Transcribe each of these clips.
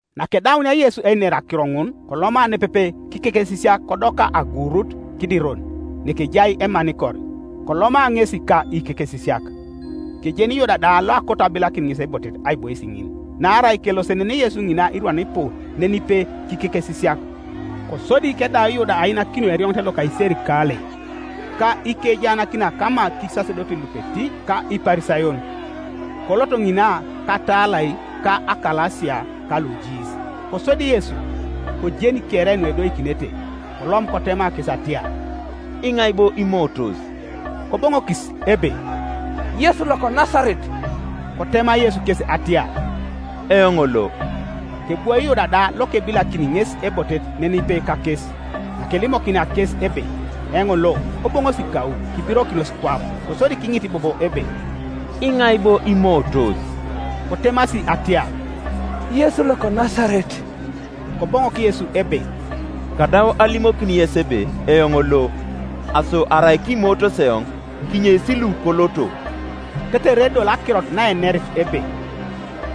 Nakedaunia Yesu einer akiro ŋun, koloma nepepe kikekesisiak kodoka aguurut Kidiron, nekejai emanikor, koloma ŋesi ka ikekesisiak. Kejeni Yuda da loakoto abilakin ŋes ebotet aibois ŋin; naarai kelosenenei Yesu ŋina irwan ipu nenipe kikekesisiak. Kosodi kedau Yuda ainakinio erioŋet loka iserikalei, ka ikejaanakinak kama kisasedotin lupeti ka Iparisayon, kolot ŋina katalai ka akalasia ka lujiis. Kosodi Yesu, kojeni kere nuedoikinete, kolom kotema kes atiar, “Iŋai bo imootos?” Koboŋokis ebe, “Yesu loko Nasaret.” Kotema Yesu kes atiar, “Eoŋ lo.” Kebwoi Yuda da lokebilakini ŋes ebotet nenipe kakes. Nakelimokinia kes ebe, “Eoŋ lo,” koboŋosi kau, kibirokinos kwap. Kosodi kiŋit bobo ebe, “Iŋai bo imootos?” Kotemasi atiar, “Yesu loko Nasaret.” Koboŋok Yesu ebe, “Kadau alimokin yes ebe eoŋ lo: aso arai kimootos eoŋ, kinyeis lu koloto.” Tetere edoli akirot naenerit ebe,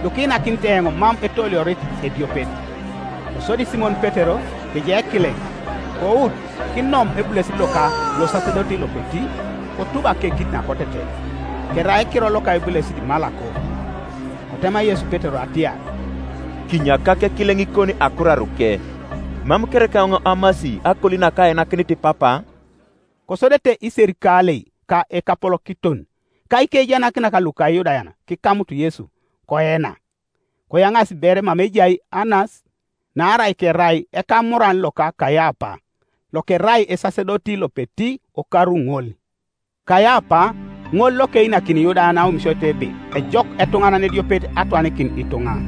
“Lukiinakinit eoŋ mam etooliorit ediopet.” Kosodi Simon Petero, kejai ekileŋ, kout kinom ebulesit loka losasedoti lopeti, kotub akekit nakoteten. Kerai ekiror loka ebulesit Malako. Kotema Yesu Petero atiar, “Kinyakak ekileŋikon akuraruke; mam kereka eoŋ amasi akoli nakainakinit Papa?” Kosodete iserikalei ka ekapolokiton ka ikejaanakinak luka Iyudayan kikamut Yesu, koena, Koyaŋaasi ber mama ejai Anas; naarai kerai ekamuran loka Kaiapa lokerai esasedoti lopeti okaru ŋol. Kaiapa ŋol lokeinakin Iyudayan aomisioit ebe ejok etuŋanan ediopet atwanikin ituŋa.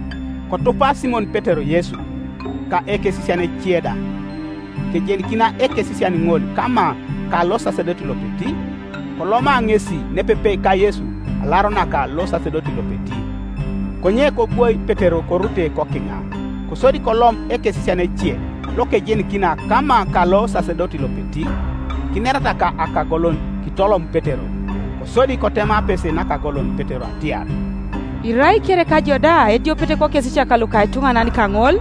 Kotupa Simon Petero Yesu, ka ekesisian ece da. Kejenikina ekesisian ŋol kama ka losasedoti lopeti, koloma ŋesi nepepe ka Yesu alaro naka losasedoti lopeti; konye kobwoi Petero korute kokiŋa. Kosodi kolom ekesisian ece lokejenikina kama ka losasedoti lopeti, kinerata ka akagolon, kitolom Petero. Kosodi kotema apese nakagolon Petero atiar, “Irai kereka ijo da ediopet kokesisiak luka etuŋanan kaŋol?”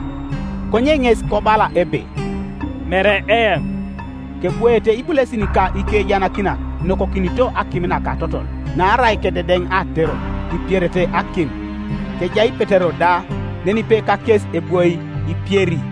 Konye ŋes kobala ebe, “Mere eoŋ.” Kebwoete ibulesin ka ikejaanakinak inokokinito akim naka atotol; naarai kededen aaterot; ipierete akim; kejai Petero da nenipe kakes ebwoi ipieri.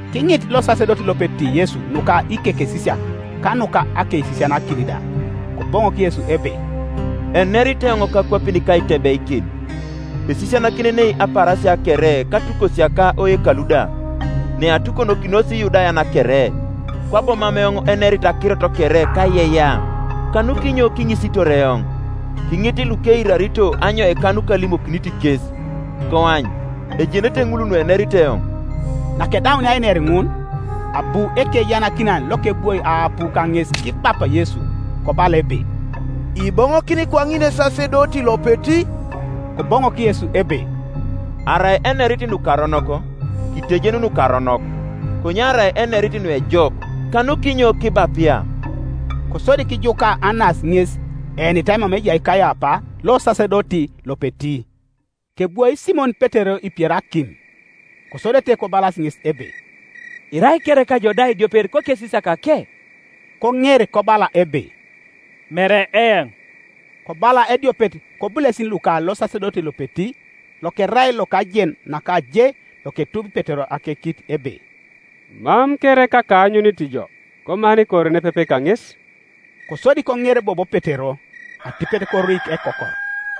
Kiŋit losasedoti lopeti Yesu nuka ikekesisiak ka nuka akeisisianakin da. Koboŋok Yesu ebe, “Enerit eoŋ kakwapin kaitebeikin; esisianakinenei apaarasia kere katukosia ka oyekalu da, neatukonokinos Iyudayan kere; kwabo mam eoŋ enerit akirot kere kaiyeiyea. Kanukinyo kiŋisitor eoŋ? Kiŋit lukeirarito anyoika nukalimokinit kes; koany, ejenete ŋul nuenerit eoŋ.” Nakedaunia einer ŋun, abu ekejaanakinan lokebwoi aapu kaŋes kibapa Yesu, kobala ebe, “Iboŋokini kwaŋin esasedoti lopeti?” Koboŋok Yesu ebe, “Arai enerit nukaronok kitejen nukaronok; konye arai enerit nuejok, kanukinyo kibapia?” Kosodi kijuka Anas ŋes eenitai mama ejai Kaiapa losasedoti lopeti. Kebwoi Simon Petero ipieri akim. Kosodete kobalas ŋes ebe, “Irai kereka ijo da ediopet kokesisiakake?” Koŋer kobala ebe, “Mere eoŋ.” Kobala ediopet kobulesin luka losasedoti lopeti, lokerai lokajen naka je loketubi Petero akekit ebe, “Mam kereka kaanyunit jo komanikor nepepe kaŋesi” Kosodi koŋer bobo Petero: atipet koruik ekokor.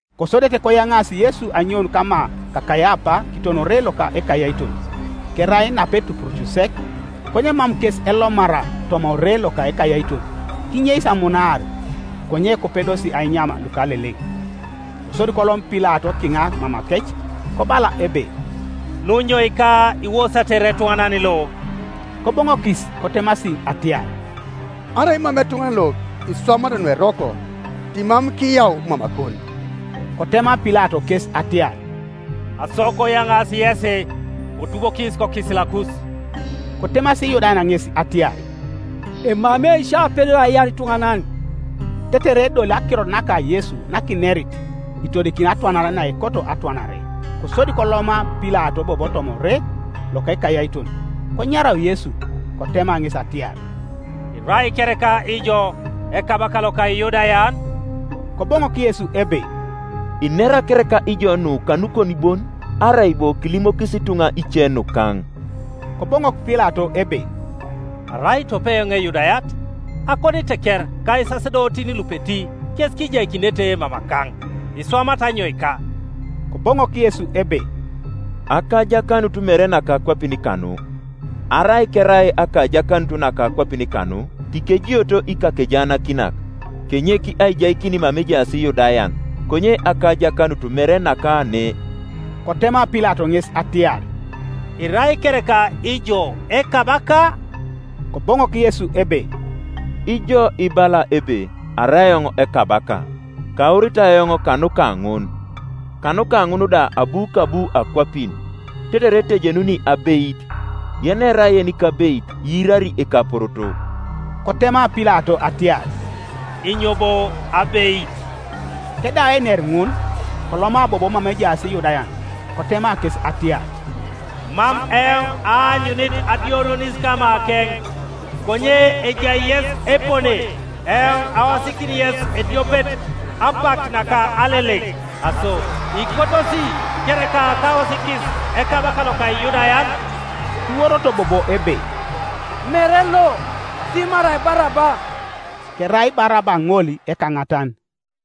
Kosodete koyaŋaasi Yesu anyoun kama ka Kaiapa kiton ore loka ekayaiton: kerai napetupuruc sek: konye mam kes elomara toma ore loka ekayaiton, kinyeis amunaar, konye kopedosi ainyam lukaleleŋ, Kosodi kolom Pilato kiŋa mamakec, kobala ebe, “Nunyoika iwosatere etuŋanan lo?” Koboŋokis kotemasi atiar, “Arai mam etuŋanan lo iswamat nueroko, timam kiyau mamakon.” Kotema Pilato kes atiar, “Aso koyaŋaasi yesi, kotubokis kokisilikus.” Kotemasi Iyudayan ŋes atiar, “Emamei sio apedor aiar ituŋanan.” Tetere edoli akirot naka Yesu nakinerit, itodikini atwanare naekoto atwanare. Kosodi koloma Pilato bobo toma ore loka ekayaiton, konyarau Yesu, kotema ŋes atiar, “Irai kereka ijo Ekabaka loka Iyudayan?” Koboŋok Yesu ebe, “Inera kereka ijo nu kanukon bon, arai bo kilimokis ituŋa ice nukaŋ?” Koboŋok Pilato ebe, “Arai tope eoŋ Eyudayat? Akoniteker ka isasedotin lupeti kes kijaikinete mamakaŋ, Iswamat anyoika?” Koboŋok Yesu ebe, “Akajakanut mere naka akwapin kanu: arai kerai akajakanut naka akwapin kanu, tikejioto ikakejaanakinak, kenyek aijaikin mama ejaas Iyudayan; konye akajakanut mere naka ne.” Kotema Pilato ŋes atiar, “Irai kereka ijo ekabaka?” Koboŋok Yesu ebe, “Ijo ibala ebe arai eoŋ ekabaka. Kauritai eoŋ kanuka ŋun, kanuka ŋun da abu kabu akwapin, tetere etejenuni abeit. Yenerai yenikabeit iirari ekaporoto.” Kotema Pilato atiar, “Inyo bo abeit?” Kedau einer ŋun, koloma bobo mama ejaas Iyudayan, kotema kes atiar, “Mam eoŋ aanyunit adioronis kamakeŋ. Konye ejai yes epone, eoŋ aosikin yes ediopet apak naka Aleleŋ: aso ikotosi kereka kaosikis Ekabaka loka Iyudayan?” Kiworoto bobo ebe, “Mere lo, dimarai Baraba.” Kerai Baraba ŋol ekaŋatan.